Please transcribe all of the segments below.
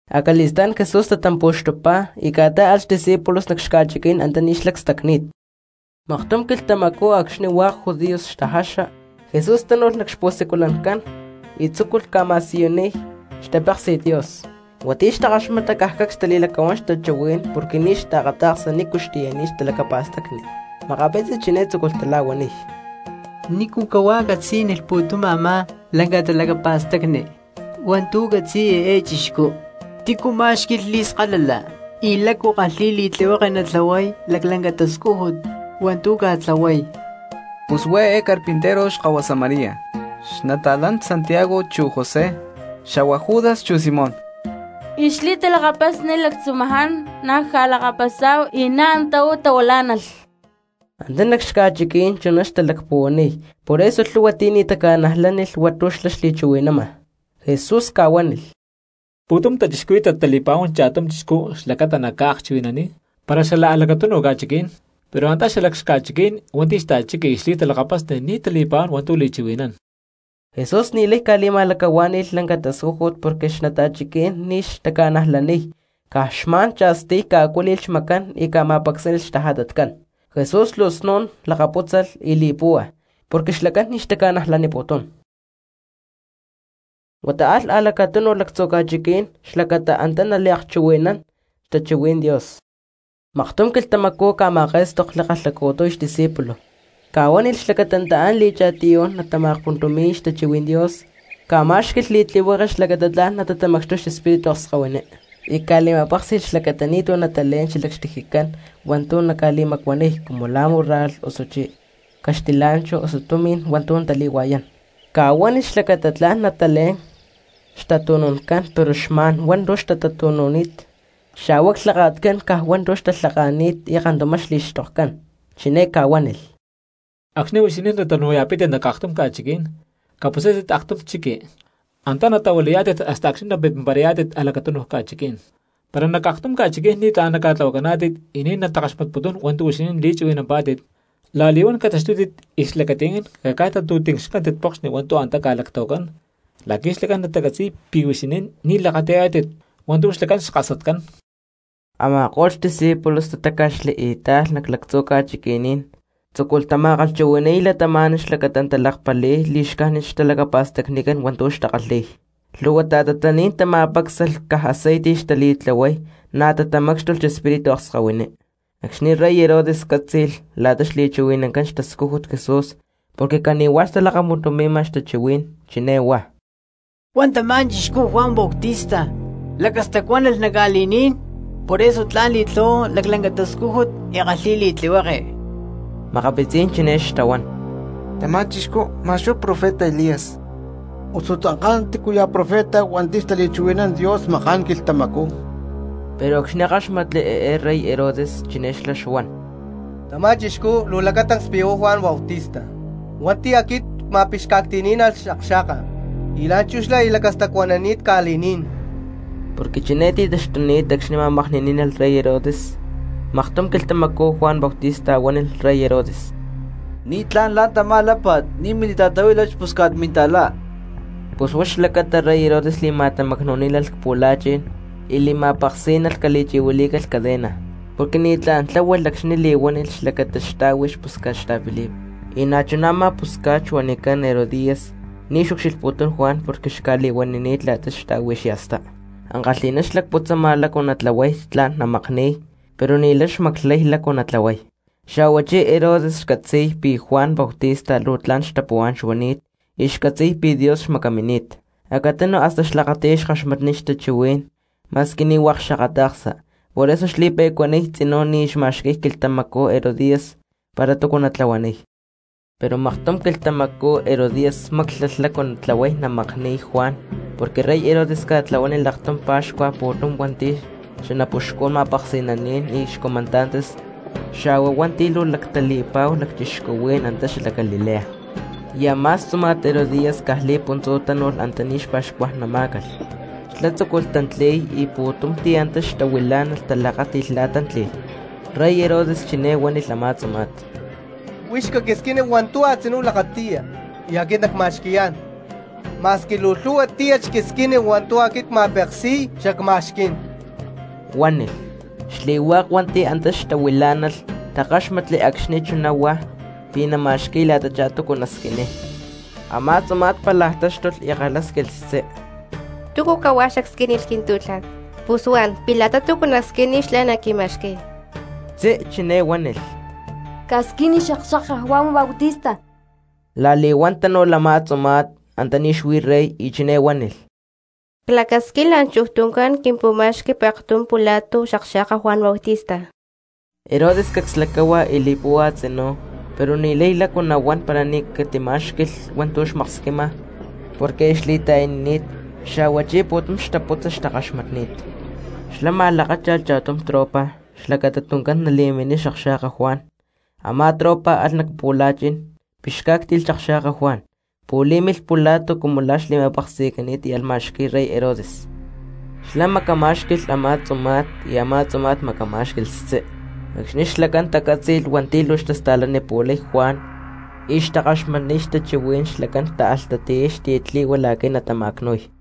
Acali̠stá̠n Jesús tatampu̠xtupá y ca̠tá̠alh xdiscípulos nac xca̠chiquí̠n antaní xlá cstacni̠t. Maktum quilhtamacú acxni̠ hua̠k judíos xtajaxa, Jesús tánu̠lh nac xpu̠siculancán y tzúculh ca̠ma̠siyuniy cristianos xtapéksi̠t Dios. Hua̠nti̠ xtakaxmata caj cacs xtali̠lacahuán xtachuhuí̠n porque ni̠ xtaakata̠ksa nícu xtiyani̠t talacapa̠stacni. Makapitzi chiné tzúculh tala̠huaniy: —¿Nícu cahuá catzí̠nilh pu̠tum a̠má lanca talacapa̠stacni hua̠ntu̠ catzi̠y eé chixcú? ¿Tícu má̠xqui̠lh li̠skalala y lácu kálhi̠lh li̠tlihueke nali̠tlahuay laclanca tascújut hua̠ntu̠ ca̠tlahuay? Pus huá eé carpintero xkahuasa María, y xli̠talakapasni Santiago chu José xa̠hua Judas chu Simón, y xli̠talakapasni lactzumaján na̠ cca̠lakapasá̠hu y antá na̠ uú tahuilá̠nalh. Antá nac xca̠chiquí̠n chuná xtalacpuhuaniy por eso lhu̠hua ti̠ ni̠ taca̠najlánilh hua̠ntu̠ xlá xli̠chuhui̠nama. Jesús ca̠huánilh: —Pu̠tum cristianos tali̠pa̠huán cha̠tum chixcú xlacata naca̠akchuhui̠naniy para xala a̠lacatunu ca̠chiquí̠n, pero antá xalac xca̠chiquí̠n hua̠nti̠ xta̠chiqui y xli̠talakapasni ni̠ tali̠pa̠huán hua̠ntu̠ li̠chuhui̠nán. Jesús ni̠lay ca̠li̠ma̠lacahuá̠ni̠lh lanca tascújut porque xnata̠chiquí̠n ni̠ xtaca̠najlaniy, caj xma̠n cha̠stiy ca̠acuíli̠lh xmacán y ca̠ma̠pacsánilh xtajatatcán. Jesús luu snu̠n lakapútzalh y li̠púhua porque xlacán ni̠ xtaca̠najlaniputún. Huata alh a̠lacatunu lactzu̠ ca̠chiquí̠n xlacata antá naliakchuhui̠nán xtachuhuí̠n Dios. Maktum quilhtamacú ca̠ma̠ké̠stokli kalhacu̠tiy xdiscípulos, ca̠huánilh xlacata nataán li̠cha̠tiyú̠n natama̠akpuntumi̠y xtachuhuí̠n Dios, ca̠ma̠xqui̠lh li̠tlihueke xlacata tla̠n natamacxtuy xespíritu akskahuiní. Y ca̠li̠ma̠péksi̠lh xlacata ni̠tu̠ natalé̠n xalac xtijicán hua̠ntu̠ naca̠li̠macuaniy cumu la̠ múrralh, osuchí caxtilá̠nchahu, osu tumi̠n hua̠ntu̠ natali̠hua̠yán. Ca̠huánilh xlacata tla̠n natalé̠n xtatu̠nu̠ncán pero xma̠n hua̠ntu̠ xtatatu̠nu̠ni̠t, xa̠hua clhaka̠tcán caj hua̠ntu̠ xtalhaka̠ni̠t, y kantumá xli̠xtokcán. Chiné ca̠huánilh: —Acxni̠ huixinín natanu̠ya̠pítit nac aktum ca̠chiquí̠n, caputzátit aktum chiqui, antá natahuilayá̠tit hasta acxni̠ napimparayá̠tit a̠lacatunu ca̠chiquí̠n. Para nac aktum ca̠chiquí̠n ni̠tlá̠n naca̠tlahuacaná̠tit y ni̠ natakaxmatputun hua̠ntu̠ huixinín li̠chuhui̠nampá̠tit, la̠li̠huán cataxtútit y cxlacati̠ncán caca̠tantu̠tincxcántit pokxni hua̠ntu̠ antá ca̠lactahuacán la̠qui̠ xlacán natacatzi̠y pi̠ huixinín ni̠ lakati̠yá̠tit hua̠ntu̠ xlacán xkasatcán. Ama̠ko̠lh discípulos tatáca̠xli y táalh nac lactzu̠ ca̠chiqui̠ní̠n, tzúculh tama̠kalhchuhui̠ni̠y cristianos xlacata natalakpali̠y li̠xcájnit xtalacapa̠stacnicán hua̠ntu̠ xtakalhi̠y. Lhu̠hua ta̠tatlaní̠n tama̠pácsalh caj aceite xtali̠tlahuay, na̠ tatamácxtulh xespíritu akskahuiní. Acxni̠ rey Herodes cátzi̠lh la̠ta xli̠chuhui̠nancán xtascújut Jesús porque cani̠huá xtalakapuntumi̠ma xtachuhuí̠n, chiné huá: —Huá tamá chixcú, Juan Bautista, lacastacuánalh nac ca̠li̠ní̠n, por eso tla̠n li̠tlahuay laclanca tascújut y kalhi̠y li̠tlihueke. Makapitzí̠n cristianos chiné xtahuán: —Tamá chixcú ma̠x huá profeta Elías, osu tzanká tícuya̠ profeta hua̠nti̠ xtaliakchuhui̠nán Dios maká̠n quilhtamacú. Pero acxni̠ káxmatli eé rey Herodes, chiné xlá xuan: —Tamá chixcú luu lacatancs pi̠ huá Juan Bautista hua̠nti̠ aquit cma̠pixca̠cti̠ní̠nalh xakxa̠ka y la̠nchú xlá aya lacastacuanani̠t ca̠li̠ní̠n. Porque chiné ti̠taxtuni̠t acxni̠ ma̠makni̠ní̠nalh rey Herodes. Maktum quilhtamacú Juan Bautista huánilh rey Herodes. —Ni̠tlá̠n la̠ntamá lápa̠t, ni̠ mili̠ta̠tahuílat xpusca̠t minta̠lá. Pus huá xlacata rey Herodes li̠ma̠tamacnu̠ní̠nalh cpu̠la̠chi̠n y li̠ma̠peksí̠nalh cali̠chi̠huilí̠calh cadena, porque ni̠tlá̠n tla̠hualh acxni̠ li̠huánilh xlacata xtá̠hui xpusca̠t xta̠Felipe. Y na̠chuná a̠má pusca̠t xuanicán Herodías ni̠ xucxilhputún Juan porque xca̠li̠huanini̠t la̠ta xtá̠hui xya̠stá, ankalhi̠ná xlacputzama lácu natlahuay tla̠n namakni̠y, pero ni̠lay xmaclay lácu natlahuay. Xa̠huachí Herodes xcatzi̠y pi̠ Juan Bautista luu tla̠n cristiano xuani̠t y xcatzi̠y pi̠ Dios xmacamini̠t, acatunu hasta xlakati̠y xkaxmatniy xtachuhuí̠n ma̠squi ni̠ hua̠k xakata̠ksa. Por eso xli̠pe̠cuaniy tzinú, ni̠ xma̠xqui̠y quilhtamacú Herodías para túcu natlahuaniy. Pero maktum quilhtamacú Herodías máclalh lácu natlahuay namakni̠y Juan porque rey Herodes ca̠tlahuánilh aktum pa̠xcua pu̠tum hua̠nti̠ xanapuxcún ma̠peksi̠naní̠n y xcomandantes xa̠hua hua̠nti̠ luu lactali̠pa̠hu lacchixcuhuí̠n antá xalac Galilea. Y a̠má xtzuma̠t Herodías caj li̠puntzú tánu̠lh antaní xpa̠xcuajnamá̠calh, xlá tzúculh tantli̠y y pu̠tum ti̠ antá xtahuilá̠nalh talakáti̠lh la̠ tántli̠lh. Rey Herodes chiné huánilh a̠má tzuma̠t: —Huix caquisquini hua̠ntu̠ a̠tzinú lakati̠ya y aquit nacma̠xqui̠yá̠n. Ma̠squi luu lhu̠hua tíyat xquisquini hua̠ntu̠ aquit cma̠peksi̠y xacma̠xquí̠n, huánilh. Xli̠hua̠k hua̠nti̠ antá xtahuilá̠nalh takáxmatli acxni̠ chuná huá pi̠ nama̠xqui̠y la̠tachá túcu nasquiniy. Amá tzuma̠t pálaj táxtulh y kalhásquilh xtzí: —¿Túcu cahuá xacsquínilh quintú̠tla̠t, pus huan pi̠ la̠ta túcu nacsquiniy xlá naquima̠xqui̠y? Xtzí chiné huánilh: —Casquini xakxa̠ka Juan Bautista. La̠li̠huán tánu̠lh a̠má tzuma̠t antaní xuí rey y chiné huánilh: —Clacasquín la̠nchuj tuncán quimpu̠ma̠xqui pektum pula̠tu xakxa̠ka Juan Bautista. Herodes cacs lacáhua y li̠púhua tzinú, pero ni̠lay lácu nahuán para ni̠ catimá̠xqui̠lh hua̠ntu̠ xmaksquima porque aya xli̠ta̠yanini̠t, xa̠huachí pu̠tum xtaputza xtakaxmatni̠t. Xlá ma̠lakácha̠lh cha̠tum tropa xlacata tuncán nali̠miniy xakxa̠ka Juan. Amá tropa alh nac pu̠la̠chi̠n, pixcá̠cti̠lh xakxa̠ka Juan, pu̠lí̠milh pula̠tu cumu la̠ xli̠ma̠peksi̠cani̠t y alh ma̠xqui̠y rey Herodes. Xlá macamá̠xqui̠lh a̠má tzuma̠t, y a̠má tzuma̠t macamá̠xqui̠lh xtzí. Acxni̠ xlacán tacátzi̠lh hua̠nti̠ luu xtasta̠lanipu̠lay Juan y xtakaxmatniy xtachuhuí̠n xlacán táalh tatiyay xtiyatli̠hua la̠qui̠ natama̠cnu̠y.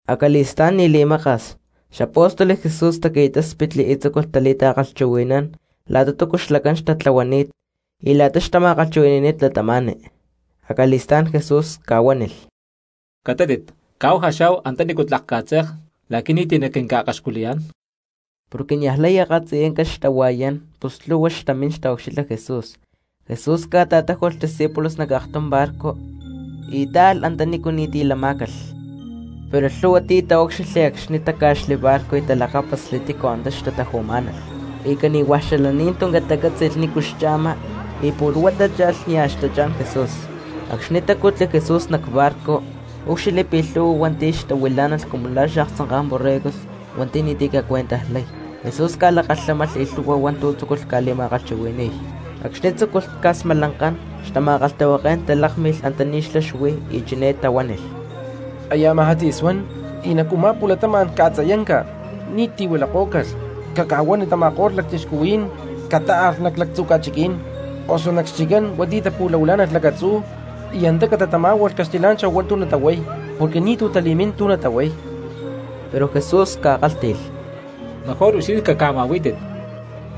Acali̠stá̠n ni̠ li̠maka̠s, xapóstoles Jesús taqui̠táspitli y tzúculh tali̠ta̠kalhchuhui̠nán la̠ta túcu xlacán xtatlahuani̠t y la̠ta xtama̠kalhchuhui̠ni̠ni̠t cristianos. Acali̠stá̠n Jesús ca̠huánilh: —Catátit caáhu jaxá̠hu antanícu tlak ca̠tze̠k la̠qui̠ ni̠ti̠ naquinca̠akaxculiyá̠n. Porque niajlay akatziyanca xtahua̠yán pus lhu̠hua xtamín taucxilha Jesús. Jesús ca̠ta̠táju̠lh xdiscípulos nac aktum barco y táalh antanícu ni̠ti̠ lama cristianos. Pero lhu̠hua cristianos taúcxilhli acxni̠ táca̠xli barco y talakápasli tícu antá xtataju̠má̠nalh, y cani̠hua̠ xalaní̠n tuncán tacátzi̠lh nícu xcha̠ma y pu̠lh huá tácha̠lh nia̠ xtachá̠n Jesús. Acxni̠ tacutli Jesús nac barco úcxilhli pi̠ lhu̠hua cristianos xtahuilá̠nalh cumu la̠ xaaktzanká̠n borregos hua̠nti̠ ni̠ti̠ ca̠cuentajlay; Jesús ca̠lakalhámalh y lhu̠hua hua̠ntu̠ tzúculh ca̠li̠ma̠kalhchuhui̠ni̠y. Acxni̠ tzúculh ca̠smalankán xtama̠kalhtahuaké̠n talákmilh antaní xlá xuí y chiné tahuánilh: —Aya amajá tzi̠suán y nac u̠má pu̠latama̠n ca̠tziyanca, ni̠ti̠ huilakó̠calh. Caca̠huani tama̠ko̠lh cristianos catáalh nac lactzu̠ ca̠chiquí̠n osu nac xchiccán hua̠nti̠ tapu̠lahuilá̠nalh lacatzú y antá catatamá̠hualh caxtilá̠nchahu hua̠ntu̠ natahuay porque ni̠tu̠ tali̠mín tu̠ natahuay. Pero Jesús ca̠kálhti̠lh: —Mejor huixinín caca̠ma̠huí̠tit.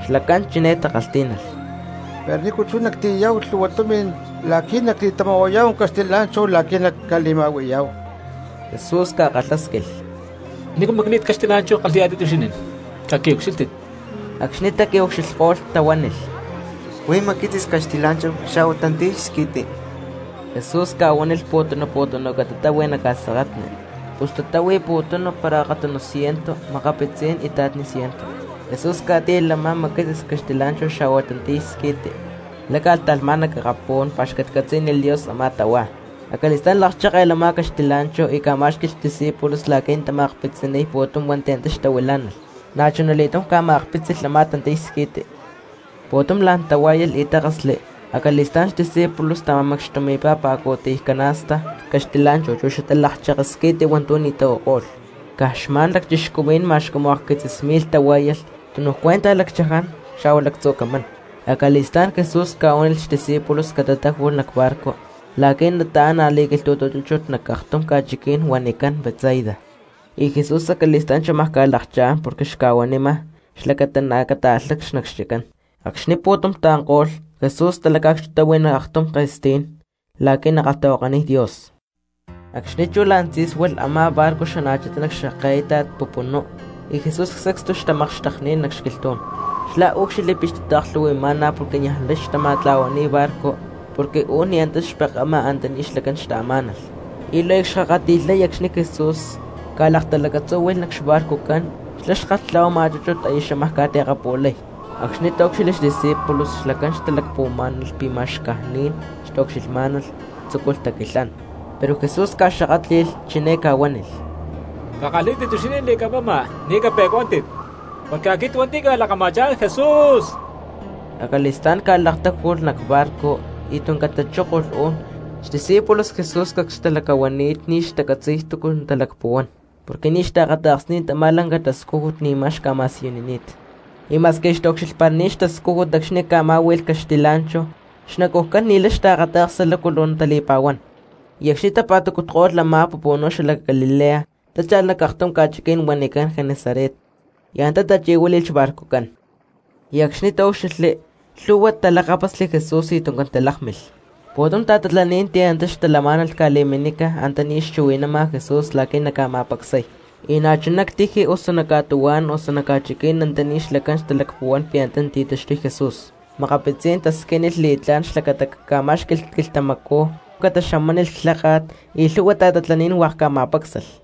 Xlacán chiné takalhtí̠nalh: —Pero ¿nícu chú nactiyayá̠hu lhu̠hua tumi̠n la̠qui̠ nacli̠tama̠huayá̠hu caxtilá̠nchahu la̠qui̠ nacca̠ma̠hui̠yá̠hu? Jesús ca̠kalhásquilh: —¿Nícu macli̠t caxtilá̠nchahu kalhi̠yá̠tit huixinín? Caqui̠ucxílhtit. Acxni taqui̠ucxilhko̠lh tahuánilh: —Huí macquitzis caxtilá̠nchahu xa̠hua tantiy squi̠ti. Jesús ca̠huánilh cristianos pu̠tunu pu̠tunu catatáhui nac ca̠seketni. Pus tatáhui pu̠tunu para akatunu ciento, makapitzí̠n ita̠tni ciento cristianos. Jesús ca̠chípalh a̠má macquitzis caxtilá̠nchahu xa̠hua tantiy squi̠ti, láca̠lh ta̠lhmá̠n nac akapú̠n, pa̠xcatcatzí̠nilh Dios a̠má tahuá. Acali̠stá̠n lakchékelh a̠má caxtilá̠nchahu y ca̠má̠xqui̠lh xdiscípulos la̠qui̠ natama̠akpitziniy pu̠tum ti̠ antá xtahuilá̠nalh, na̠chuna li̠túm ca̠ma̠akpítzilh a̠má tantiy squi̠ti. Pu̠tum la̠n tahuá̠yalh y tákasli. Acali̠stá̠n xdiscípulos tama̠macxtumi̠pá pa̠cu̠tiy canasta caxtilá̠nchahu chu xatalakcheke squi̠ti hua̠ntu̠ ni̠ tahuako̠lh a̠má cristianos. Caj xma̠n lacchixcuhuí̠n ma̠x cumu akquitzis mi̠lh tahuá̠yalh, tunuj cuenta lacchaján xa̠hua lactzu̠ camán. Acali̠stá̠n Jesús ca̠huánilh xdiscípulos catatáju̠lh nac barco la̠quí̠ nataán a̠li̠quilhtu̠tu chúchut nac aktum ca̠chiquí̠n huanicán Betsaida; y Jesús acali̠stá̠n xámaj ca̠lakchá̠n porque xca̠huanima cristianos xlacata na̠ cataalhá nac xchiccán. Acxni̠ taanko̠lh pu̠tum cristianos, Jesús talaca̠cxtutáhui nac aktum ke̠stí̠n la̠qui̠ nakalhtahuakaniy Dios. Acxni̠ chú la̠n tzí̠sualh a̠má barco xana̠chitá nac xke̠íta̠t pupunú y Jesús sacstu xtamakxtekni̠t nac xquilhtú̠n. Xlá úcxilhli pi̠ xtata̠klhu̠hui̠má̠nalh porque niajlay xtama̠tla̠huani̠y barco porque u̠n ni̠ antá xpekama antaní xlacán xtaamá̠nalh. Y luu aya cxkakati̠lhay acxni̠ Jesús ca̠laktalacatzúhui̠lh nac xbarcojcán xlá xkalhtla̠huama chúchut, aya xámaj ca̠ti̠akapu̠lay. Acxni̠ taúcxilhli xdiscípulos xlacán xtalacpuhuamá̠nalh pi̠ ma̠x caj ni̠n xtaucxilhmá̠nalh, tzúculh taquilhán. Pero Jesús ca̠xakátli̠lh chiné ca̠huánilh: —¡Cakalhí̠tit huixinín li̠camama, ni̠ cape̠cuántit; porque aquit hua̠nti̠ cca̠lakama̠chá̠n Jesús! Acali̠stá̠n ca̠laktáju̠lh nac barco y tuncán tachókolh u̠n; xdiscípulos Jesús cacs xtalacahuani̠t ni̠ xtacatzi̠y túcu natalacpuhuán porque ni̠ xtaakata̠ksni̠t a̠má lanca tascújut ni̠ma xca̠ma̠siyunini̠t, y ma̠squi aya xtaucxilhparani̠t xtascújut acxni̠ ca̠má̠hui̠lh caxtilá̠nchahu, xnacujcán ni̠lay xtaakata̠ksa lácu luu natali̠pa̠huán. Y acxni̠ tapa̠tacutko̠lh a̠má pupunú xalac Galilea tácha̠lh nac aktum ca̠chiquí̠n huanicán Genesaret, y antá tachi̠huíli̠lh xbarcojcán. Y acxni̠ tatácutli, lhu̠hua cristianos talakápasli Jesús y tuncán talákmilh. Pu̠tum ta̠tatlaní̠n ti̠ antá xtalamá̠nalh ca̠li̠minca antaní xchuhui̠nama Jesús la̠qui̠ naca̠ma̠pacsay; y na̠chuná ctiji, osu nac ca̠tuhuá̠n, osu nac ca̠chiquí̠n antaní xlacán xtalacpuhuán pi̠ antá nati̠taxtuy Jesús. Makapitzí̠n cristianos xtasquiniy li̠tlá̠n xlacata caca̠má̠xqui̠lh quilhtamacú cataxamánilh clháka̠t, y lhúhua ta̠tatlaní̠n hua̠k ca̠ma̠pácsalh.